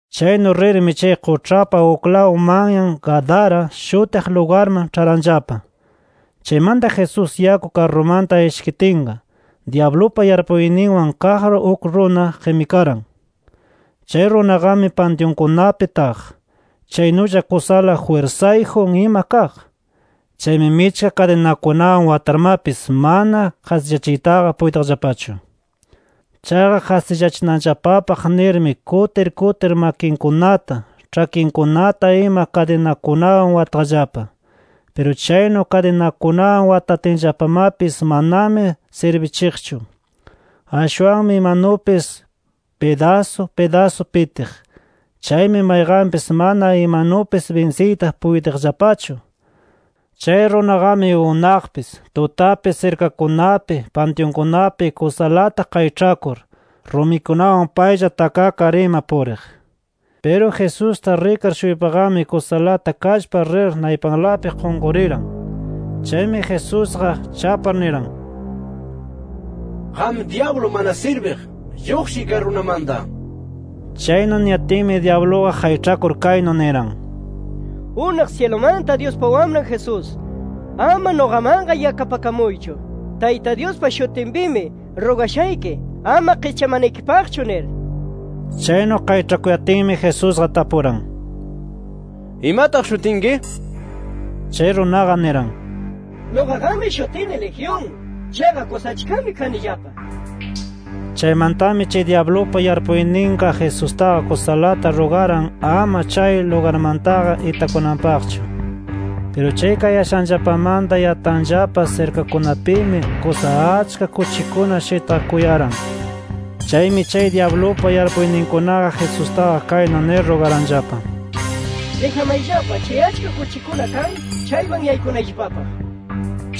Chaynu rirmi chay quĉhapa uklaw manyan Gadara shutiq lugarman ĉharanllapa. Chaymanta Jesús yaku karrumanta ishkitinqa, dyablupa yarpuyninwan kaq uk runa qimikaran. Chay runaqami pantyunkunapi taq. Chaynulla kusala jwirsayjun ima kaq. Chaymi michka kadinakunawan watarmapis mana qasillachiytaqa puytiqllapachu. Chaqa qasillachinanllapapaq nirmi kutir kutir makinkunata, ĉhakinkunata ima kadinakunawan wataqllapa. Piru chaynu kadinakunawan watatinllapamapis manami sirbichiqchu. Ashwanmi imanupis pidasu pidasu pitiq. Chaymi mayqanpis mana imanupis binsiyta puytiqllapachu. Chay runaqami unaqpis, tutapis, sirkakunapi, pantyunkunapi kusalata qayĉhakur, rumikunawan paylla takakar ima puriq. Piru Jesusta rikar-shuypaqami kusalata kallpar rir naypalanpi qunquriran. Chaymi Jesusqa chapar niran: —Qam, dyablu mana sirbiq, lluqshiy kay runamanta nir. Chaynu niyatinmi dyabluqa qayĉhakur kaynu niran: —¡Unaq syilumanta Dyuspa Wamran Jesús, ama nuqamanqa yakapakamuychu! ¡Tayta Dyuspa shutinpimi rugashayki ama qischamanaykipaqchu! nir. Chaynu qayĉhakuyatinmi Jesusqa tapuran: —¿Imataq shutinki? nir. Chay runaqa niran: —Nuqaqami shutini ‘Legión’. Chaqa kusa achkami kanillapa nir. Chaymantami chay dyablupa yarpuyninqa Jesustaqa kusalata rugaran ama chay lugarmantaqa itakunanpaqchu. Piru chay kayashanllapamanta yatanllapa sirkakunapimi kusa achka kuchikuna shitqakuyaran. Chaymi chay dyablupa yarpuyninkunaqa, Jesustaqa kaynu nir rugaranllapa: —Dijamayllapa chay achka kuchikuna kan chayman yaykunayllapapaq nir.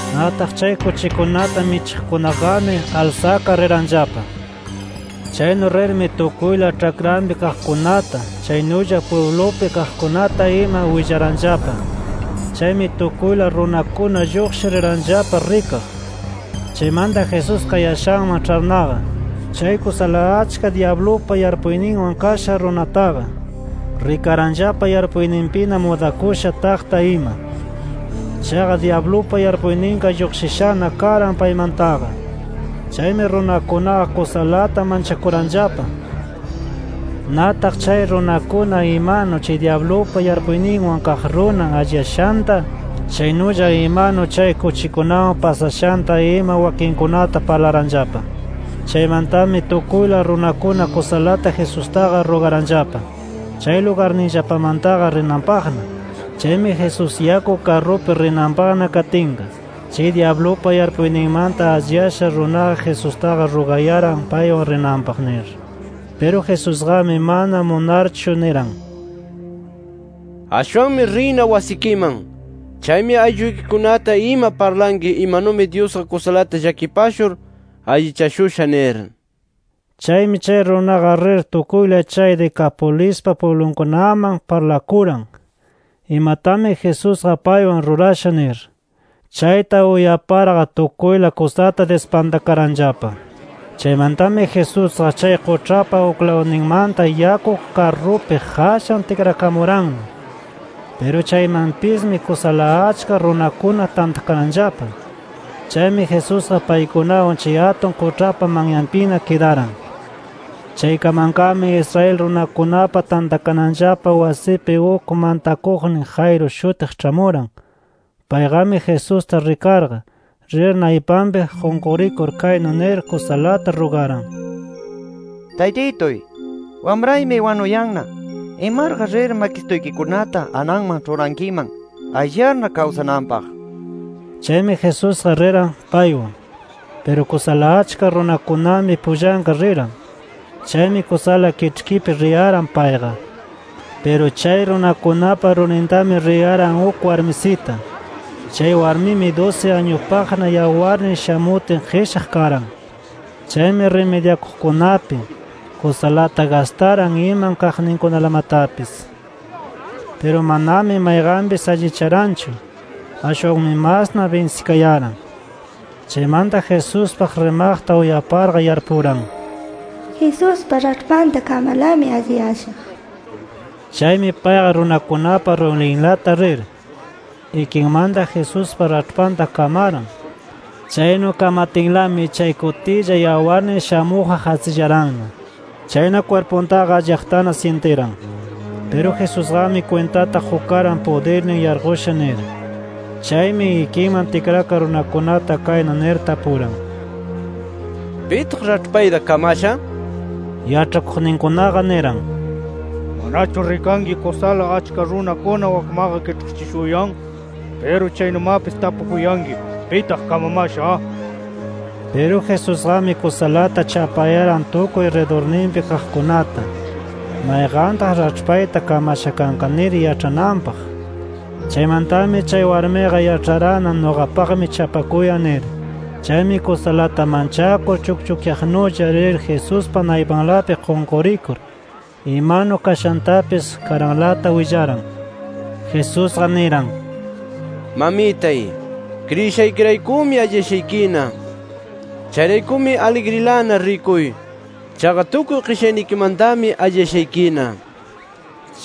Nataq chay kuchikunata michiqkunaqami alsakar riranllapa. Chaynu rirmi tukuyla ĉhakranpi kaqkunata chaynulla pwiblupi kaqkunata ima willaranllapa. Chaymi tukuyla runakuna lluqshir riranllapa rikaq. Chaymanta Jesús kayashanman ĉharnaqa, chay kusala achka dyablupa yarpuyninwan kasha runataqa, rikaranllapa yarpuyninpina mudakusha taqta ima. Chaqa dyablupa yarpuyninqa lluqshishana karan paymantaqa. Chaymi runakunaqa kusalata manchakuranllapa. Nataq chay runakuna imanu chay dyablupa yarpuyninwan kaq runa alliyashanta, chaynulla imanu chay kuchikunawan pasashanta ima wakinkunata parlaranllapa. Chaymantami tukuyla runakuna kusalata Jesustaqa rugaranllapa, chay lugarninllapamantaqa rinanpaqna. Chaymi Jesús yaku karrupi rinanpaqna katinqa chay dyablupa yarpuyninmanta alliyasha runaqa Jesustaqa rugayaran paywan rinanpaq nir. Piru Jesusqami mana munarchu niran: —Ashwanmi riyna wasikiman. Chaymi aylluykikunata ima parlanki imanumi Dyusqa kusalata llakipashur allichashusha nir. Chaymi chay runaqa rir tukuyla chay Decapolispa pwiblunkunaman parlakuran, imatami Jesusqa paywan rurasha nir. Chayta uyaparqa tukuyla kusata dispantakaranllapa. Chaymantami Jesusqa chay quĉhapa uklawninmanta yaku karrupi qashan tikrakamuranna. Piru chaymanpismi kusala achka runakuna tantakaranllapa. Chaymi Jesusqa paykunawan chay atun quĉhapa manyanpina kidaran. Chaykamanqami Israel runakunapa tantakananllapa wasipi uk mantakuqnin Jairo shutiq ĉhamuran. Payqami Jesusta rikarqa, rir naypanpi qunqurikur kaynu nir kusalata rugaran: —Taytituy, wamraymi wanuyanna. Imaraq rir makisituykikunata ananman ĉhurankiman, alliyarna kawsananpaq nir. Chaymi Jesusqa riran paywan. Piru kusala achka runakunami pullanqa riran. Chaymi kusala kiĉhkipi riyaran payqa. Piru chay runakunapa rurintami riyaran uk warmisita. Chay warmimi dusi añupaqna yawarnin shamutin qishaq karan. Chaymi rimidyakuqkunapi, kusalata gastaran iman kaqninkunalamatapis. Piru manami mayqanpis allicharanchu. Ashwanmi masna binsikayaran. Chaymanta Jesuspaq rimaqta uyaparqa yarpuran: “Jesuspa raĉhpanta kamarlami alliyashaq” nir. Chaymi payqa runakunapa rurinlata rir, ikinmanta Jesuspa raĉhpanta kamaran. Chaynu kamatinlami, chay kutilla yawarnin shamuqqa qasillaranna. Chayna kwirpuntaqa alliyaqtana syintiran. Piru Jesusqami kwintata qukaran pudirnin yarqusha nir. Chaymi ikiman tikrakar runakunata kaynu nir tapuran: —¿Pitaq raĉhpayta kamasha? nir. Yaĉhakuqninkunaqa niran: —¿Manachu rikanki kusala achka runakuna wakmaqa kiĉhkichishuyan? Piru chaynumapis tapukuyanki: ‘¿Pitaq kamamasha?’ nir. Piru Jesusqami kusalata chapayaran tukuy ridurninpi kaqkunata, mayqantaq raĉhpayta kamasha kanqa nir yaĉhananpaq. Chaymantami chay warmiqa yaĉharanna nuqapaqmi chapakuyan nir. Chaymi kusalata manchakur chukchukyaqnulla rir Jesuspa naypalanpi qunqurikur, imanu kashantapis karanlata willaran. Jesusqa niran: —Mamitay, kriyishaykiraykumi alliyashaykina. Chayraykumi aligrilana rikuy. Chaqa tukuy qishaynikimantami alliyashaykina.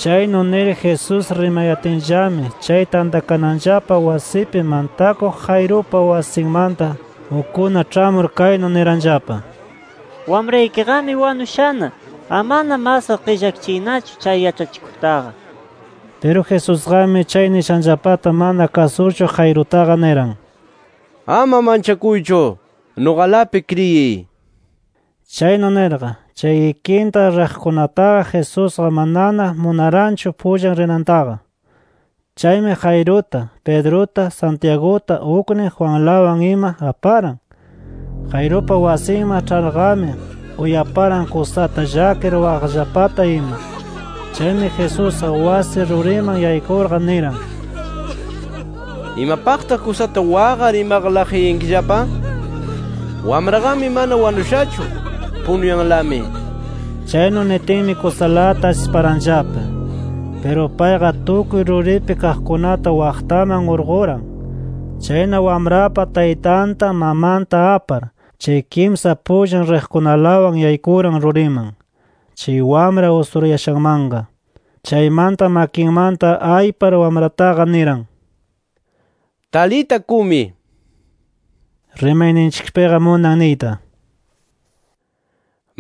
Chaynu nir Jesús rimayatinllami, chay tantakananllapa wasipi mantakuq Jairupa wasinmanta ukkuna ĉhamur kaynu niranllapa: —Wamraykiqami wanushana. Amana masqa qillakachiynachu chay yaĉhachikuqtaqa nir. Piru Jesusqami chay nishanllapata mana kasurchu, Jairutaqa niran: —Ama manchakuychu. Nuqalapi kriyiy nir. Chaynu nirqa, chay ikinta riqkunataqa Jesusqa manana munaranchu pullan rinantaqa. Chaymi Jairuta, Pedruta, Santiaguta uknin Juanlawan ima aparan. Jairupa wasinman ĉharqami, uyaparan kusata llakir waqaqllapata ima. Chaymi Jesusqa wasi ruriman yaykurqa niran: —¿Imapaqtaq kusata waqar imaqa laqyayankillapa? Wamraqami mana wanushachu. Punuyanlami nir. Chaynu nitinmi kusalata asiparanllapa. Piru payqa tukuy ruripi kaqkunata waqtaman urquran. Chayna wamrapa taytanta, mamanta apar, chay kimsa pullan riqkunalawan yaykuran ruriman, chay wamra usurayashanmanqa. Chaymanta makinmanta aypar wamrataqa niran: —Talita cumi. (Rimayninchikpiqa munan niyta: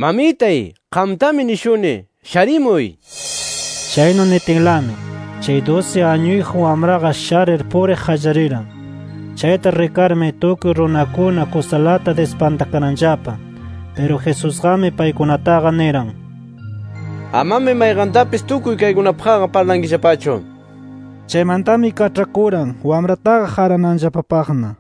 “Mamitay, qamtami nishuni: ¡Sharimuy!” nir). Chaynu nitinlami, chay dusi añuyjun wamraqa sharir puriq qallariran. Chayta rikarmi tukuy runakuna kusalata dispantakaranllapa. Piru Jesusqami paykunataqa niran: —Amami mayqantapis tukuy kaykunapaqqa parlankillapachu nir. Chaymantami kaĉhakuran wamrataqa qarananllapapaqna.